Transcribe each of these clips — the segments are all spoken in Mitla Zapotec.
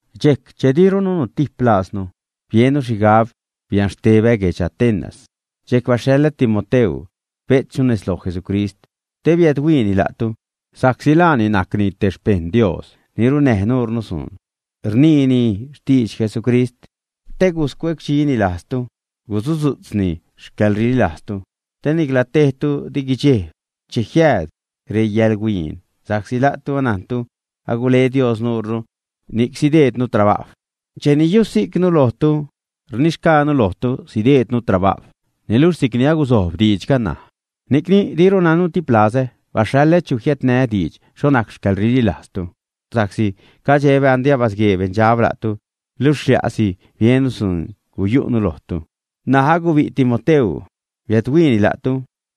Dxejc, che dirunu nutijp lajznu, biennu xhigab bianxtebä guedx Atenas. Dxejc baxhaḻä Timoteu, bejtznu nez loj Jesucrist, te biädhuiini la'tu, sa'csi laani najcni te xpeṉ Dios ni runnäj nuurnu dzuun, rniini xtidx Jesucrist, te guscuecdxini lajztu, guzudzu'tzni xcäḻrililajztu. Te nicla tejtu di guidxejb che jiääd reyäḻhuin sa'csi la'tu anajntu agule Dios nuurnu ni'c sidejdnu trabajw. Cheni yusijcnu lojtu, rnixgaanu lojtu sidejdnu trabajw; niluxh si'cni agusojb diidxga ṉaj. Ni'cni diruna nutiplazä, baxhaḻä chu jiädnä diidx xho najc xcäḻrililajztu, sa'csi cadxebä andi abasguee beṉdxab la'tu, luxh xlia'si biennu dzuun guyu'nu lojtu. N̲aj agubi' Timoteu, biädhuiini la'tu.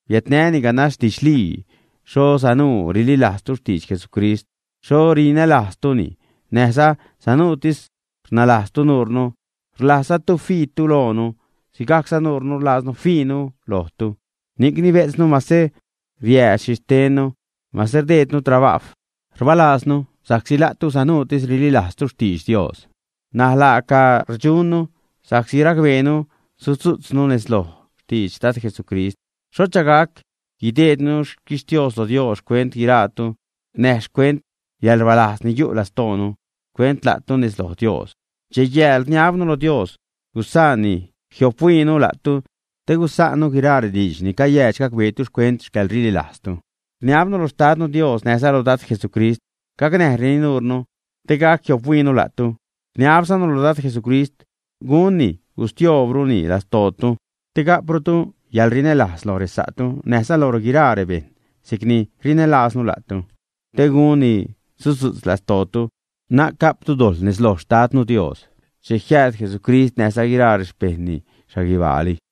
Biadnäni ganax didxlii xho sanuu rililajztu xtidx Jesucrist, xho rinälajztuni, näjza sanuutis rnalajztu nuurnu, rlajzzatu fiitu loonu, sigajcza nuurnu rlajznu fiinu lojtu. Ni'cni, betznu, masä riäädx xhixtennu, masä rdeednu trabajw, rbalajznu sa'csi la'tu sanuutis rililajztu xtidx Dios. N̲aj laaca rdxunnu sa'csi racbeenu sudzu'tztu nez loj xtidx Dad Jesucrist. Xhocha gac guideednu xquixtios lo Dios xcuent guiraatu näj xcuent yäḻrbalajz ni yu' lastoonu xcuent la'tu nez lo Dios. Dxej-yääl rniabnu lo Dios gusaanni jiophuiinu la'tu te gusa'nu guiraa rediidx ni cayäädx gacbeetu xcuent xcäḻrlilajztu. Rniabnu lo Xtadnu Dios, näjza lo Dad Jesucrist, gacnäjreni nuurnu te gac jiophuiinu la'tu. Rniabzanu lo Dad Jesucrist, gunni gustiobruni lastootu te ga'prutu yäḻrinälajz loj resa'tu näjza loj guiraa rebejṉ, si'cni rinälajznu la'tu, te gunni sudzu'tz lastootu, na'c ga'ptu dojḻ nez lo Xtadnu Dios, che jiääd Jesucrist näjza guiraa rexpejṉni xhaguibaali.